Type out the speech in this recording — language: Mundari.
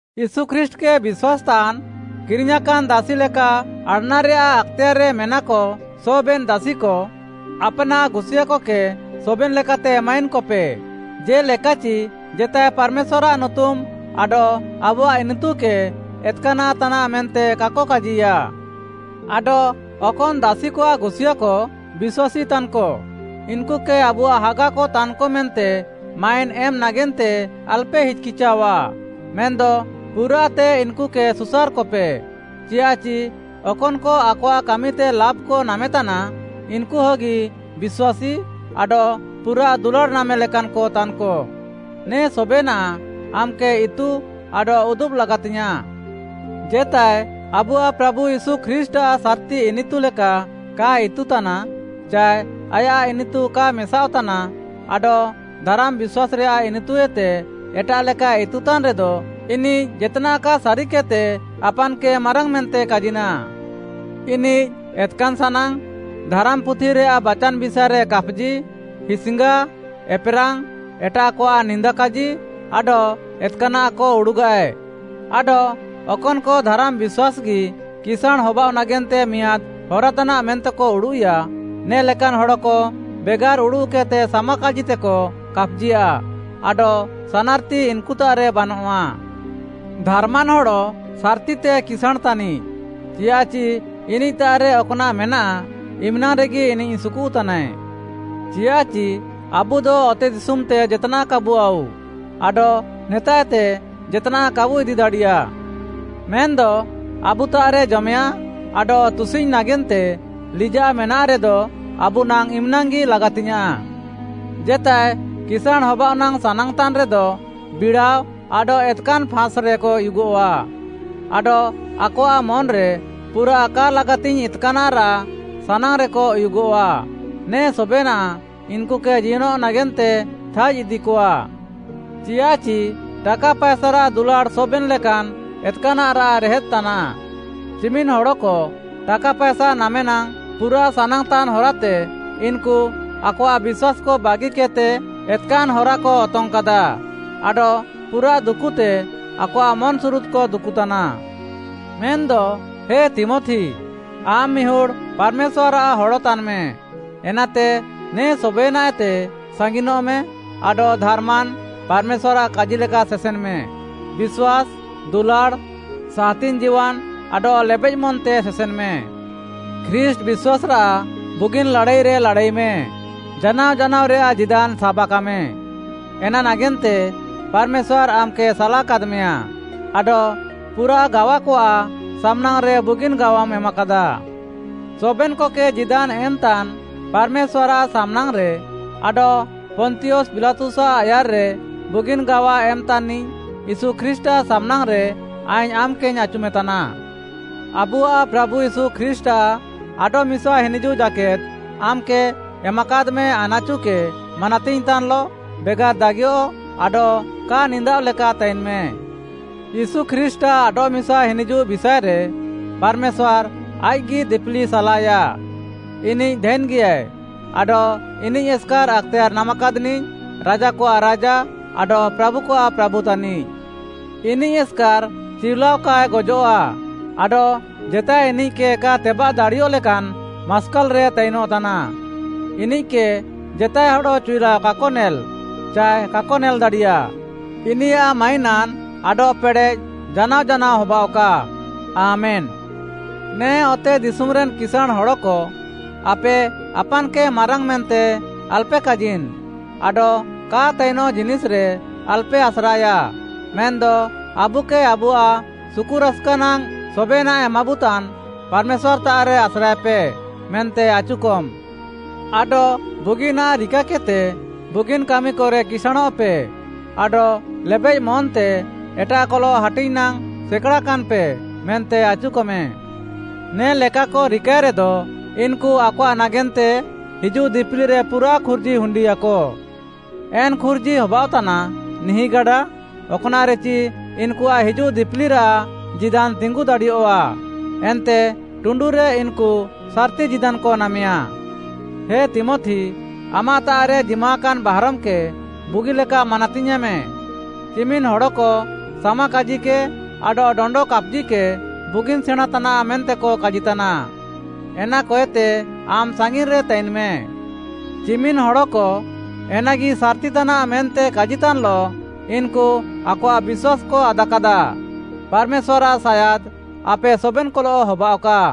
ୟୀଶୁ ଖ୍ରୀଷ୍ଟ୍‌କେ ବିଶ୍ୱାସ୍‌ତାନ୍‌ କିରିଙ୍ଗ୍‌ୟାଁକାନ୍‌ ଦାସି ଲେକା ଆଡ଼୍‌ନାରେୟାଃ ଆକ୍‌ତେୟାର୍‌ରେ ମେନାକ ସବେନ୍‌ ଦାସିକ ଆପ୍‌ନାଃ ଗୁସିୟାଁକକେ ସବେନ୍‌ ଲେକାତେ ମାଇନ୍‌କପେ, ଜେ'ଲେକାଚି ଜେତାଏ ପାର୍‌ମେଶ୍ୱାର୍‌ଆଃ ନୁତୁମ୍‌ ଆଡଃ ଆବୁଆଃ ଇନିତୁକେ ଏତ୍‌କାନାଃ ତାନାଃ ମେନ୍ତେ କାକ କାଜିୟା। ଆଡଃ ଅକନ୍‌ ଦାସିକଆଃ ଗୁସିୟାଁକ ବିଶ୍ୱାସୀତାନ୍‌କ, ଇନ୍‌କୁକେ ଆବୁଆଃ ହାଗାକ ତାନ୍‌କ ମେନ୍ତେ ମାଇନ୍‌ ଏମ୍‌ ନାଗେନ୍ତେ ଆଲ୍‌ପେ ହିଚ୍‌କିଚାଅଃଆ, ମେନ୍‌ଦ ପୁରାଃତେ ଇନ୍‌କୁକେ ସୁସାର୍‌କପେ, ଚିୟାଃଚି ଅକନ୍‌କ ଆକଆଃ କାମିତେ ଲାଭ୍‌କ ନାମେତାନା, ଇନ୍‌କୁ ହଗି ବିଶ୍ୱାସୀ ଆଡଃ ପୁରାଃ ଦୁଲାଡ଼୍‌ ନାମେ ଲେକାନ୍‌କ ତାନ୍‌କ। ନେ ସବେନାଃ ଆମ୍‌କେ ଇତୁ ଆଡଃ ଉଦୁବ୍‌ ଲାଗାତିଙ୍ଗ୍‌ୟାଁଃ। ଜେତାଏ ଆବୁଆଃ ପ୍ରାଭୁ ୟୀଶୁ ଖ୍ରୀଷ୍ଟ୍‌ଆଃ ସାର୍‌ତି ଇନିତୁ ଲେକା କାଏ ଇତୁତାନା, ଚାଏ ଆୟାଃ ଇନିତୁ କା ମେସାଅଃତାନା ଆଡଃ ଧାରାମ୍‌ ବିଶ୍ୱାସ୍‌ରେଆଃ ଇନିତୁଏତେ ଏଟାଃଲେକାଏ ଇତୁତାନ୍‌ରେଦ, ଇନିଃ ଜେତ୍‌ନାଃ କା ସାରିକେଦ୍‌ତେ ଆପାନ୍‌କେ ମାରାଙ୍ଗ୍‌ ମେନ୍ତେ କାଜିନାଃ। ଇନିଃ ଏତ୍‌କାନ୍‌ ସାନାଙ୍ଗ୍‌, ଧାରାମ୍‌ପୁଥିରାଃ ବାଚାନ୍‌ ବିଷାଏରେ କାପ୍‌ଜି, ହିସ୍‌ଙ୍ଗା, ଏପ୍‌ରାଙ୍ଗ୍‌, ଏଟାଃକଆଃ ନିନ୍ଦାକାଜି, ଆଡଃ ଏତ୍‌କାନାଃକ ଉଡ଼ୁଗାଃଏ, ଆଡଃ ଅକନ୍‌କ ଧାରାମ୍‌ ବିଶ୍ୱାସ୍‌ଗି କିସାଁଣ୍‌ ହବାଅଃ ନାଗେନ୍ତେ ମିଆଁଦ୍‌ ହରାତାନାଃ ମେନ୍ତେକ ଉଡ଼ୁଃଇୟା, ନେ ଲେକାନ୍‌ ହଡ଼କ ବେଗାର୍‌ ଉଡ଼ୁଃକେଦ୍‌ତେ ସାମାକାଜିତେକ କାପ୍‌ଜିୟାଃ ଆଡଃ ସାନାର୍‌ତି ଇନ୍‌କୁତାଃରେ ବାନଃଆ। ଧାର୍‌ମାନ୍‌ ହଡ଼ ସାର୍‌ତିତେ କିସାଁଣ୍‌ ତାନିଃ, ଚିୟାଃଚି ଇନିଃତାଃରେ ଅକ୍‌ନାଃ ମେନାଃ ଇମ୍‌ନାଙ୍ଗ୍‌ରେଗି ଇନିଃ ସୁକୁଃତାନାଏ। ଚିୟାଃଚି ଆବୁଦ ଅତେଦିଶୁମ୍‌ତେ ଜେତ୍‌ନାଃ କାବୁ ଆଉ, ଆଡଃ ନେତାଃଏତେ ଜେତ୍‌ନାଃ କାବୁ ଇଦି ଦାଡ଼ିୟା। ମେନ୍‌ଦ ଆବୁତାଃରେ ଜମେୟାଃଁ, ଆଡଃ ତୁସିଙ୍ଗ୍‌ ନାଗେନ୍ତେ ଲିଜାଃ ମେନାଃରେଦ, ଆବୁ ନାଙ୍ଗ୍‌ ଇମ୍‌ନାଙ୍ଗ୍‌ଗି ଲାଗାତିଙ୍ଗ୍‌ୟାଁଃ। ଜେତାଏ କିସାଁଣ୍‌ ହବାଅଃ ନାଙ୍ଗ୍‌ ସାନାଙ୍ଗ୍‌ତାନ୍‌ରେଦ, ବିଡ଼ାଅ ଆଡଃ ଏତ୍‌କାନ୍‌ ଫାଁସ୍‌ରେକ ଉୟୁଗଃଆ, ଆଡଃ ଆକଆଃ ମନ୍‌ରେ ପୁରାଃ କା ଲାଗାତିଙ୍ଗ୍‌ ଏତ୍‌କାନ୍‌ରାଃ ସାନାଙ୍ଗ୍‌ରେକ ଉୟୁଗଃଆ, ନେ ସବେନାଃ ଇନ୍‌କୁକେ ଜିୟନଃ ନାଗେନ୍ତେ ଥାଇଜ୍‌ ଇଦିକଆ। ଚିୟାଃଚି ଟାକା ପାଏସାରାଃ ଦୁଲାଡ଼୍‌ ସବେନ୍‌ ଲେକାନ୍‌ ଏତ୍‍କାନାଃରାଃ ରେହେଦ୍‌ ତାନାଃ। ଚିମିନ୍‌ ହଡ଼କ ଟାକା ପାଏସା ନାମେ ନାଙ୍ଗ୍‌ ପୁରାଃ ସାନାଙ୍ଗ୍‌ତାନ୍‌ ହରାତେ, ଇନ୍‌କୁ ଆକଆଃ ବିଶ୍ୱାସ୍‌କ ବାଗିକେଦ୍‌ତେ ଏତ୍‌କାନ୍‌ ହରାକ ଅତଙ୍ଗ୍‌କାଦା ଆଡଃ ପୁରାଃ ଦୁକୁତେ ଆକଆଃ ମନ୍‌ସୁରୁଦ୍‌କ ଦୁକୁଃତାନା। ମେନ୍‌ଦ ହେ ତୀମଥି, ଆମ୍‌ ମିହୁଡ଼୍‌ ପାର୍‌ମେଶ୍ୱାର୍‌ଆଃ ହଡ଼ ତାନ୍‌ମେ, ଏନାତେ ନେ ସବେନାଃଏତେ ସାଙ୍ଗିନଃମେ ଆଡଃ ଧାର୍‌ମାନ୍‌, ପାର୍‌ମେଶ୍ୱାର୍‌ଆଃ କାଜିଲେକା ସେସେନ୍‌ମେ, ବିଶ୍ୱାସ୍‌, ଦୁଲାଡ଼୍‌, ସାହାତିଙ୍ଗ୍‌ ଜୀୱାନ୍‌ ଆଡଃ ଲେବେଃମନ୍‌ତେ ସେସେନ୍‌ମେ। ଖ୍ରୀଷ୍ଟ୍‌ ବିଶ୍ୱାସ୍‌ରାଃ ବୁଗିନ୍‌ ଲାଡ଼ାଇରେ ଲାଡ଼ାଇମେ, ଜାନାଅ ଜାନାଅରେୟାଃ ଜୀଦାନ୍‌ ସାବାକାମେ, ଏନା ନାଗେନ୍ତେ ପାର୍‌ମେଶ୍ୱାର୍‌ ଆମ୍‌କେ ସାଲାକାଦ୍‌ମେୟା ଆଡଃ ପୁରାଃ ଗାୱାକଆଃ ସାମ୍‍ନାଙ୍ଗ୍‌ରେ ବୁଗିନ୍‌ ଗାୱାମ୍‌ ଏମାକାଦା। ସବେନ୍‌କକେ ଜୀଦାନ୍‌ ଏମ୍‌ତାନ୍‌ ପାର୍‌ମେଶ୍ୱାର୍‌ଆଃ ସାମ୍‍ନାଙ୍ଗ୍‌ରେ ଆଡଃ ପନ୍ତିୟସ୍‌ ପିଲାତୁସ୍‌ଆଃ ଆୟାର୍‌ରେ ବୁଗିନ୍‌ ଗାୱା ଏମ୍‌ତାନ୍‌ନିଃ ୟୀଶୁ ଖ୍ରୀଷ୍ଟ୍‌ଆଃ ସାମ୍‌ନାଙ୍ଗ୍‌ରେ, ଆଇଙ୍ଗ୍‌ ଆମ୍‌କେଇଙ୍ଗ୍‌ ଆଚୁମେତାନା। ଆବୁଆଃ ପ୍ରାଭୁ ୟୀଶୁ ଖ୍ରୀଷ୍ଟ୍‌ଆଃ ଆଡଃମିସା ହିନିଜୁଃ ଜାକେଦ୍‌ ଆମ୍‌କେ ଏମାକାଦ୍‌ମେ ଆନାଚୁକେ ମାନାତିଙ୍ଗ୍‌ତାନ୍‌ଲଃ, ବେଗାର୍‌ ଦାଗିୟଃ ଆଡଃ କା ନିନ୍ଦାଅଃ ଲେକା ତାଇନ୍‌ମେ। ୟୀଶୁ ଖ୍ରୀଷ୍ଟ୍‌ଆଃ ଆଡଃମିସା ହିନିଜୁଃ ବିଷାଏରେ ପାର୍‌ମେଶ୍ୱାର୍‌ ଆଇଃକ୍‌ଗି ଦିପିଲି ସାଲାଏୟା, ଇନିଃ ଧାଇନ୍‌ଗିୟାଏ ଆଡଃ ଇନିଃ ଏସ୍‌କାର୍‌ ଆକ୍‌ତେୟାର୍‌ ନାମାକାଦ୍‌ନିଃ, ରାଜାକଆଃ ରାଜା ଆଡଃ ପ୍ରାଭୁକଆଃ ପ୍ରାଭୁ ତାନିଃ। ଇନିଃ ଏସ୍‍କାର୍‌ ଚିଉଲାଅ କାଏ ଗଜଃଆ, ଆଡଃ ଜେତାଏ ଇନିଃକେ କା ତେବାଃ ଦାଡ଼ିୟଃଲେକାନ୍‌ ମାସ୍କାଲ୍‍ରେ ତାଇନଃତାନା। ଇନିଃକେ ଜେତାଏ ହଡ଼ ଚିଉଲାଅ କାକ ନେଲ୍‌ ଚାଏ କାକ ନେଲ୍‌ଦାଡ଼ିୟା। ଇନିୟାଃ ମାଇନାନ୍‌ ଆଡଃ ପେଡ଼େଃ ଜାନାଅ ଜାନାଅ ହବାଃଅକା! ଆମେନ୍‌। ନେ ଅତେଦିଶୁମ୍‌ରେନ୍‌ କିସାଁଣ୍‌ ହଡ଼କ, ଆପେ ଆପାନ୍‌କେ ମାରାଙ୍ଗ୍‌ ମେନ୍ତେ ଆଲପେ କାଜିନ୍‌ ଆଡଃ କା ତାଇନଃ ଜିନିଷ୍‌ରେ ଆଲ୍‌ପେ ଆସ୍ରାଏୟା, ମେନ୍‌ଦ ଆବୁକେ ଆବୁଆଃ ସୁକୁରାସ୍‌କା ନାଙ୍ଗ୍‌ ସବେନାଃ ଏମାବୁତାନ୍‌ ପାର୍‌ମେଶ୍ୱାର୍‌ତାଃରେ ଆସ୍ରାଏପେ ମେନ୍ତେ ଆଚୁକମ୍‌। ଆଡଃ ବୁଗିନାଃ ରିକାକେଦ୍‌ତେ ବୁଗିନ୍‌ କାମିକରେ କିସାଁଣଃପେ, ଆଡଃ ଲେବେଃ ମନ୍‌ତେ ଏଟାଃକଲଃ ହାଟିଙ୍ଗ୍‌ ନାଙ୍ଗ୍‌ ସେକାଡ଼ାକାନ୍‌ପେ ମେନ୍ତେ ଆଚୁକମେ। ନେ ଲେକାକ ରିକାଏରେଦ, ଇନ୍‌କୁ ଆକଆଃ ନାଗେନ୍ତେ ହିଜୁଃ ଦିପିଲିରେ ପୁରାଃ ଖୁର୍ଜି ହୁଣ୍ଡିୟାକ। ଏନ୍‌ ଖୁର୍ଜି ହବାଅଃତାନା ନିହିଁଗାଡା, ଅକ୍‌ନାଃରେଚି ଇନ୍‌କୁଆଃ ହିଜୁଃ ଦିପିଲିରାଃ ଜୀଦାନ୍‌ ତିଙ୍ଗୁ ଦାଡ଼ିୟଃଆ। ଏନ୍ତେ ଟୁଣ୍ଡୁରେ ଇନ୍‌କୁ ସାର୍‌ତି ଜୀଦାନ୍‌କ ନାମେୟା। ହେ ତୀମଥି, ଆମାଃତାଃରେ ଜିମାକାନ୍‌ ବାହାରମ୍‌କେ ବୁଗିଲେକା ମାନାତିୟେଁମେ, ଚିମିନ୍‌ ହଡ଼କ ସାମାକାଜିକେ ଆଡଃ ଡଣ୍ଡ କାପ୍‌ଜିକେ ବୁଗିନ୍‌ ସେଣାଁଁ ତାନାଃ ମେନ୍ତେକ କାଜିତାନା, ଏନାକଏତେ ଆମ୍‌ ସାଙ୍ଗିନ୍‌ରେ ତାଇନ୍‌ମେ। ଚିମିନ୍‌ ହଡ଼କ ଏନାଗି ସାର୍‌ତି ତାନାଃ ମେନ୍ତେ କାଜିତାନ୍‌ଲଃ, ଇନ୍‌କୁ ଆକଆଃ ବିଶ୍ୱାସ୍‌କ ଆଦାକାଦା। ପାର୍‌ମେଶ୍ୱାର୍‌ଆଃ ସାୟାଦ୍‌ ଆପେ ସବେନ୍‌କଲଃ ହବାଅଃକା।